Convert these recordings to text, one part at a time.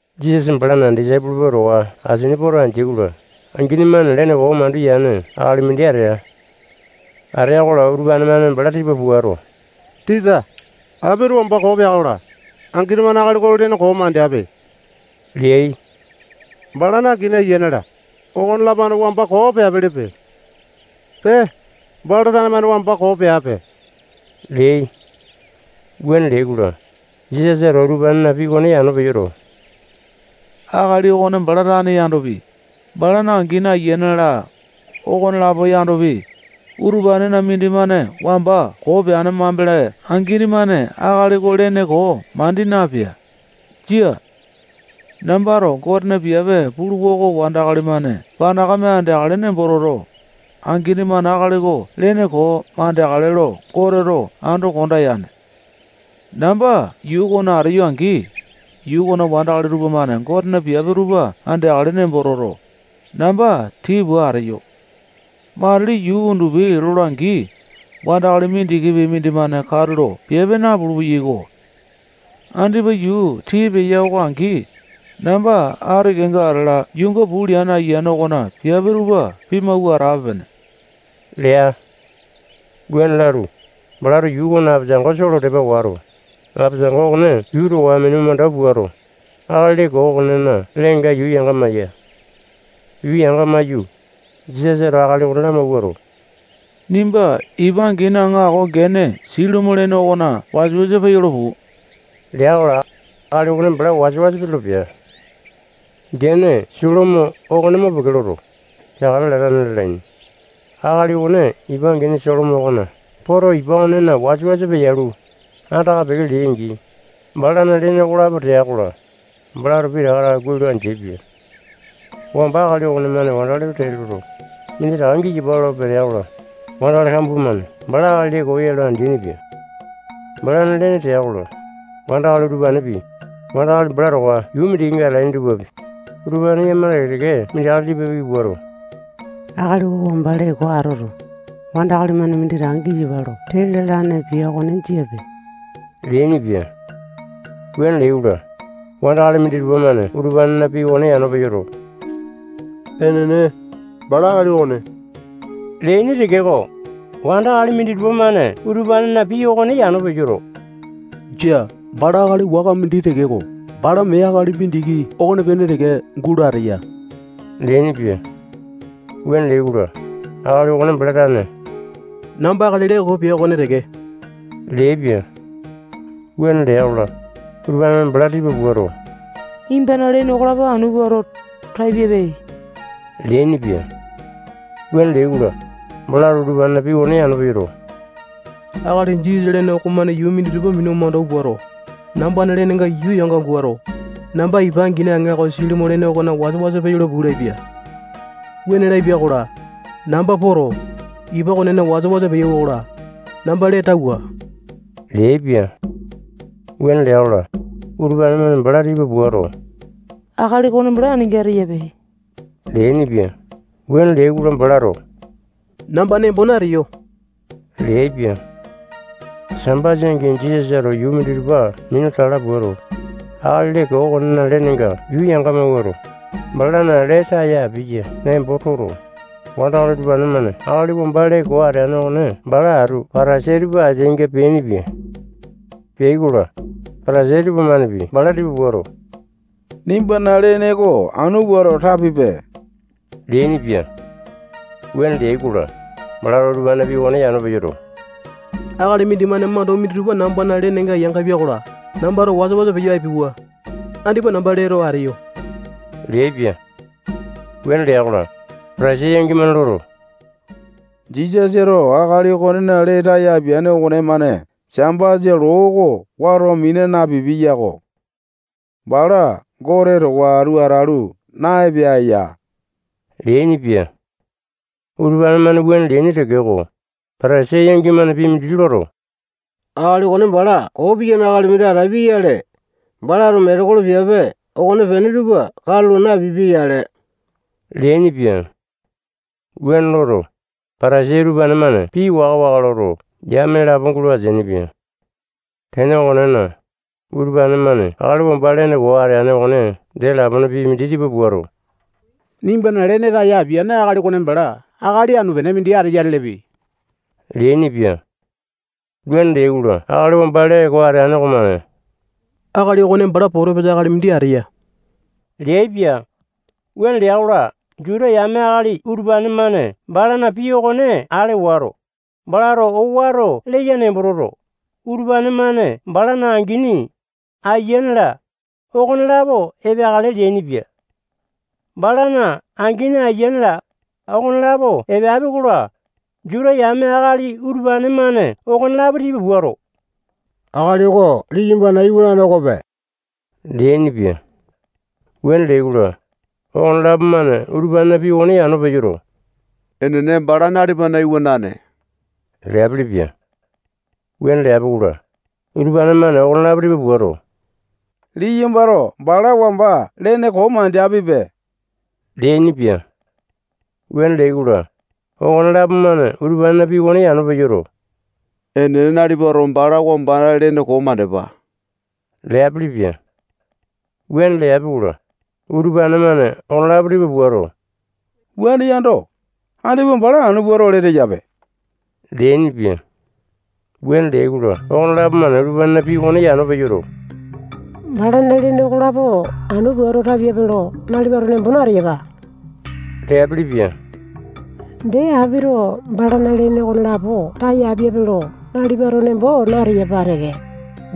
Jisasa balana disaipolo tupa towa asini poto andeai-kola, angini-mane lene koo mandu yane akali mindi atea. Atea-kola, utupane-mane bala tipa puato, tisa, apito wamba koo pea-kola, angini-mane akali oko lene koo mandeape leai. Balana angini, ayiane-la, okonelapo-mane wamba koo peapelepe. Pee, bala tane-mane wamba koo peape leai. Wuane leai-kola, Jisasato utupanena pii okone yano peyoto, akali okone bala tane yandopi, balana angini, ayiane-la, okonelapo yandopi, utupanena mindimane wamba koo peane mambele angini-mane akali oko lene koo mandi napea. Jia. Nambato Gotena piape puluwa oko wandakali-mane panakame andeakale nembo toto, angini-mane akali oko lene koo mandeakale lo Goteto ando konda yane. Namba yuu okona ateyo-angi, yuu okona wandakali tupamane Gotena piape tupa andeakale nembo toto, namba tii pua ateyo. Matili yuu undupi lola-angi, wandakali mindikipi mindimane katulo piape napulu-peyaiko. Andipa yuu tii peya oko angi, namba ati kenga atala yuunga puu leane Ayiane okona piape tupa pimawua atape-pene lea. Wuane lalu, balato yuu okona apesango soo lo tepa wato, apesango okone yuu towa minu mandau puato, akali lene koo okonena lenenga yuu yanga-maiya. Yuu yanga-maiyu, Jisasato akali okone lamawuato, nimba ipa angini aŋako gene Silomo lene okona wasa-wasa peyolo puu lea-kola, akali okone bala wasa-wasa peyolo pea. Gene Silomo okone mo peke loto, peakale latane lalaini. Akali okone ipa angini Silomo okona poto, ipa okonena wasa-wasa peyalu, andaka peke lea-angi, balana lene okolapo tea-kola, balato pitaka taka kuai lo andeaipia. Wamba akali okonemane wandakali tupa tee loto, minditaka giyapa lo petea-kola, wandakali kambua-mane bala akali lene koo ya lo andeaini-pia. Balana lene tea-kola, wandakali utupanepi, wandakali bala towa yuu mindikinga atalaini tupapi, utupane yakama teke-teke mindi akali tipa piki puato, akali oko wamba lene koo atoto, wandakali-mane minditaka giyapa lo tee lalane pia okone jiape leainipia. Wuane leai-kola, wandakali minditupa-mane utupanena pii okone yano peyoto, enene, bala akali okone leaini tekeko, wandakali minditupa-mane utupanena pii okone yano peyoto, jia, bala akali waka mindi tekeko, bala mee akali mindiki okonepene teke gulo ateya leainipia. Wuane leai-kola, akali okone bala tane namba akali lee koo pia okone teke leaipia. Wuane lea-kola, utupane-mane bala tipa puato, nimbana lene okolapo anu puato, tapiape leainipia. Wuane leai-kola, balato utupanena pii okone yano peyoto, akali Jisasa lene okomane yuu minditupa minu mandau puato, nambana lenenga yuu yanga mawuato, namba ipa angini aŋako Silomo lene okona wasa-wasa peyolo puu lapia. Wuane lapia-kola, namba poto, ipa okonena wasa-wasa peyauwa-kola, namba lee tauwa leaipia. Wuane lea-kola, utupane-mane bala tipa puato, akali okone bala aninga ateyape leainipia. Wuane leai-kola, balato namba nembo nateyo leaipia. Sambasa angi Jisasato yuu minditupa minu tala puato, akali lee koo okonena lenenga yuu yanga mawuato, balana lee taya apiya nembo toto, wandakali utupane-mane akali wamba lene koo ateane okone bala atu Patasai tupa ateainga peainipia. Peai-kola, Patasai tupamanepi bala tipa puato, nimbana lene oko anu puato tapiape leainipia. Wuane leai-kola, balato utupanena pii okone yano peyoto, akali mindimane mandau minditupa nambana lenenga yangapia-kola, nambato wasa-wasa peyo apiauwa. Andipa namba lee too ateyo leaipia. Wuane lea-kola, Patasai yangi-mane loto, Jisasato akali okonena lee taya apiane okonemane Sambasa loo oko wato mina napipia yako. Bala Gote towa atu atalu, na-epea ya leainipia. Utupane-mane wuane leaini tekeko, Patasai yangi-mane pii mindi loto, akali okone bala koo piyane akali mindi atapia-yale, balato metekolo piape okonepene tupa katulo napipia-yale leainipia. Wuane loto, Patasai utupane-mane pii waka-waka loto, yame lapo gulo ateainipia. Tene okonena, utupane-mane akali wamba lene koo ateane okone dee lapone pii mindi tipa puato, nimbana lene taya apiane akali okone bala akali anu-pene mindi ateya lelepe leainipia. Wuane leai-kola, akali wamba lee koo ateane okomane akali okone bala potopisa akali mindi ateya leaipia. Wuane lea-kola, Juta yame akali utupane-mane balana pii okone ale wato, balato owato leya nembo toto, utupane-mane balana angini, ayiane-la, okonelapo epeakale leainipia. Balana angini, ayiane-la, okonelapo epeapi-kola, Juta yame akali utupane-mane okonelapo tipa puato, akali oko liyambana iwanane okope leainipia. Wuane leai-kola, okonelapo-mane utupanena pii okone yano peyoto, enene, bala nalipana iwanane leapilipia. Wuane leapi-kola, utupane-mane okonelapo tipa puato, liyambato bala wamba lene koo mandeapipe leainipia. Wuane leai-kola, okonelapo-mane utupanena pii okone yano peyoto, enene, nalipato bala wamba lene koo mandepa leapilipia. Wuane leapi-kola, utupane-mane okonelapo tipa puato, wuane yando, andipa bala anu puato, lee teyape leainipia. Wuane leai-kola, okonelapo-mane utupanena pii okone yano peyoto, balana lene okolapo anu puato tapiape lo nalipato nembo nateyapa leapilipia. Dee, apito balana lene okolapo taya apiape lo nalipato nembo nateyapa teke.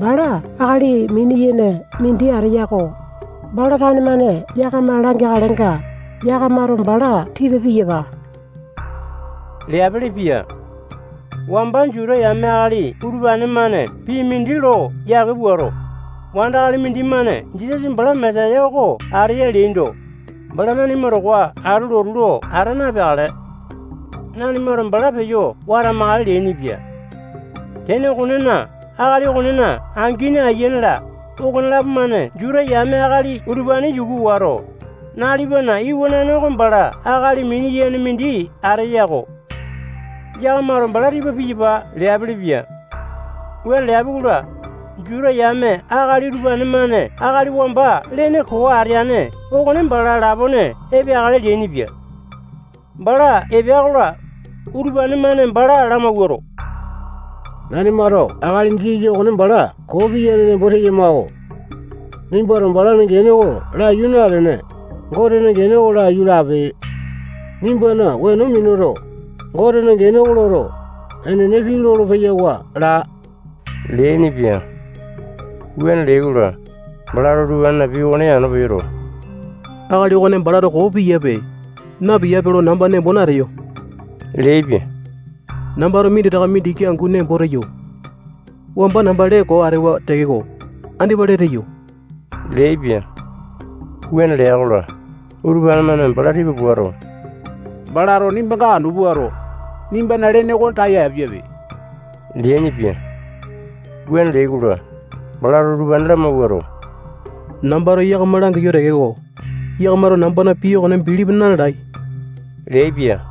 Bala akali mini-yene mindi ateya-ko. Bala tane-mane yakama langeakalenga, yakamato bala tipa piyapa leapelepia. Wamba Juta yame akali utupane-mane pii mindi lo yake puato, wandakali mindimane Jisasa bala Mesaya oko ateya leaindo, bala nanima towa atu lotu lo ata napeakale. Nanimato bala peyo watamakale leainipia. Tene okonena, akali okonena angini, ayiane-la, okonelapo-mane Juta yame akali utupane yuku wato, nalipana iwanane oko bala akali mini-yene mindi ateya-ko. Yakamato bala tipa piyapa leapelepia. Wuane leapi-kola, Juta yame akali utupane-mane akali wamba lene koo ateane okone bala lapone epeakale leainipia. Bala epea-kola, utupane-mane bala lamawuato, nanimato akali Jisasa okone bala koo piyane nembo teyama-ko. Nimbato balana gene oko laiyu nalene, Gotena gene oko laiyu lape. Nimbana weno minuto, Gotena gene oko loto, enene pii lolo-peyawa laa leainipia. Wuane leai-kola, balato utupanena pii okone yano peyoto, akali okone balato koo piyaepe, na-piyaepe lo namba nembo nateyo leaipia. Nambato minditaka mindiki angu nembo teyo. Wamba namba lee koo atewa tekeko, andipa lee teyo leaipia. Wuane lea-kola, utupane-mane bala tipa puato, balato nimbanga anu puato, nimbana lene oko taya apiape leainipia. Wuane leai-kola, balato utupane lamawuato, wamba nambato yakama langiyo tekeko, yakamato nambana pii okone bilipi na-lalai leaipia-ko.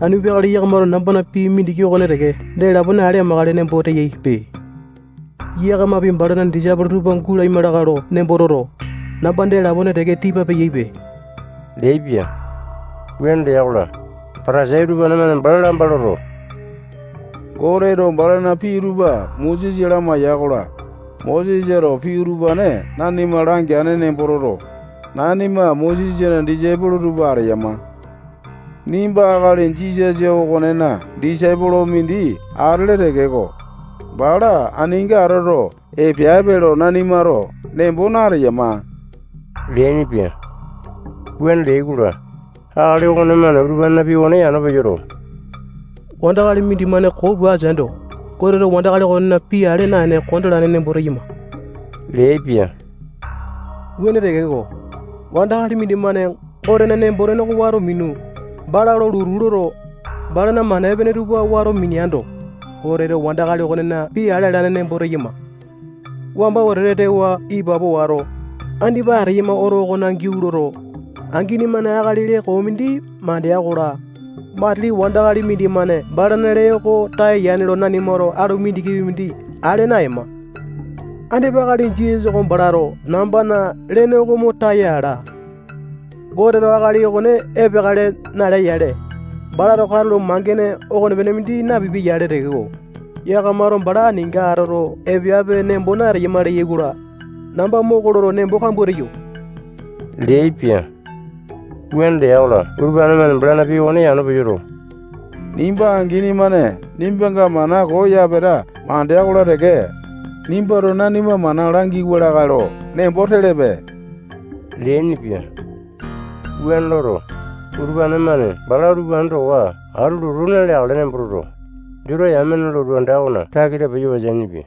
Anu peakale yakamato nambana pii mindiki okone teke dee lapone ale amakale nembo teyaipe. Yakamapi balana disaipolo tupa gulaima lakae lo nembo toto, namba dee lapone teke tipa peyaipe leaipia. Wuane lea-kola, Patasai utupane-mane bala lamba loto, Goteto balana pii tupa Mosesa lamaiya-kola, Mosesato pii utupane nanima langeane nembo toto, nanima Mosesana disaipolo tupa ateyama. Nimba akali Jisasa okonena disaipolo mindi atele tekeko, bala aninga atoto epeape lo nanimato nembo nateyama leainipia. Wuane leai-kola, akali okonemane utupanena pii okone yano peyoto, wandakali mindimane koo pua ateaindo, Goteto wandakali okonena pii ale naene kondalane nembo teyama leaipia. Wuane tekeko, wandakali mindimane Gotena nembo-tene oko wato minu, bala lo lotu loto, balana mana epene tupa wato mineando, Goteto wandakali okonena pii ale alane nembo teyama. Wamba wetete tewa ipapo wato, andipa ateyama oto okona giau loto, angini-mane akali lene koo mindi mandea-kola, matili wandakali mindimane balana lee oko taya yane lo nanimato alu mindikipi mindi ale naema. Andipa akali Jisasa oko balato nambana lene oko mo taya ala. Goteto akali okone epeakale nalea-yale, balato katulo mangene okonepene mindi napipia-yale tekeko, yakamato bala aninga atoto epeape nembo nateyama leyai-kola, namba moko loto, nembo kambua teyo leaipia. Wuane lea-kola, utupane-mane balana pii okone yano peyoto, nimba angini-mane nimbanga mana koo yapeta mandea-kola teke, nimbato nanima mana langiwa lakae lo nembo telepe leainipia. Wuane loto, utupane-mane bala utupane towa atu lotu naleakale nembo toto, Juta yamena lotu anda okona takita peyo wateainipia.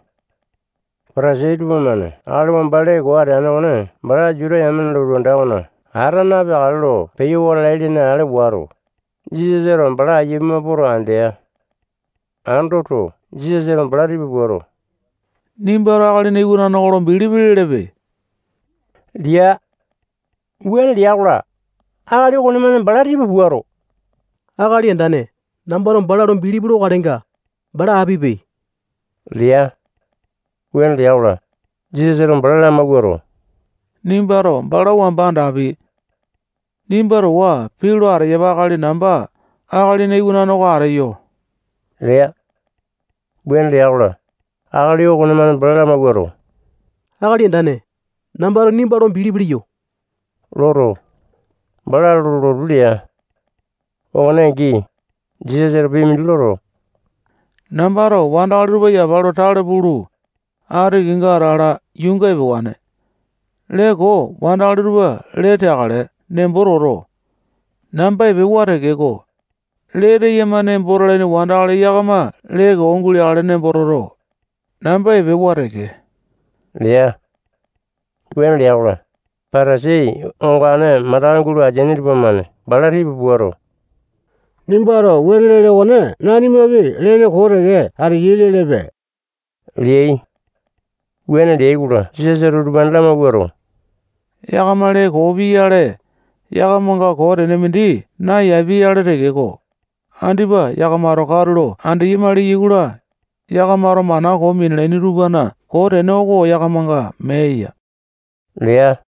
Patasai tupamane akali wamba lene koo ateane okone bala Juta yamena lotu anda okona ata napeakale lo peyo wata alai lene ale wato, Jisasato bala aiya pima poto, andea. Andoto, utupane-mane Jisasa tipa puato, nimbato Akalina Iwanane oko lo bilipi lelepe lea. Wuane lea-kola, akali okonemane bala tipa puato, Akali Andane, nambato bala lo bilipi lokalenga, bala apipe lea. Wuane lea-kola, Jisasato bala lamawuato, nimbato bala wamba andapi. Nimba towa pii lo ateyapa akali namba Akalina Iwanane oko ateyo lea. Wuane lea-kola, akali okonemane bala lamawuato, Akali Andane, nambato nimba lo bilipi leyo loto, bala lo lotu lea. Okone angi, Jisasato pii mindi loto, nambato wandakali tupa yapa lo tale pulu, ati kenga atala yuunga epewane. Lee koo wandakali tupa lee teakale nembo toto, namba epewa tekeko, lee teyama nembo talaini wandakali yakama lee koo guleakale nembo toto, namba epewa teke lea. Wuane lea-kola, Patasai ongane mandaka gulo ateaini tupamane bala tipa puato, nimbato wuane lele okone nanimapi lene koo teke ateyai lelepe leai. Wuane leai-kola, Jisasato utupane lamawuato, yakama lene koo pia-yale, yakamanga koo tene mindi nayapi-yale tekeko, andipa yakamato katulo andeyama leyai-kola, yakamato mana koo minalaini tupana koo tene oko yakamanga mee eya lea.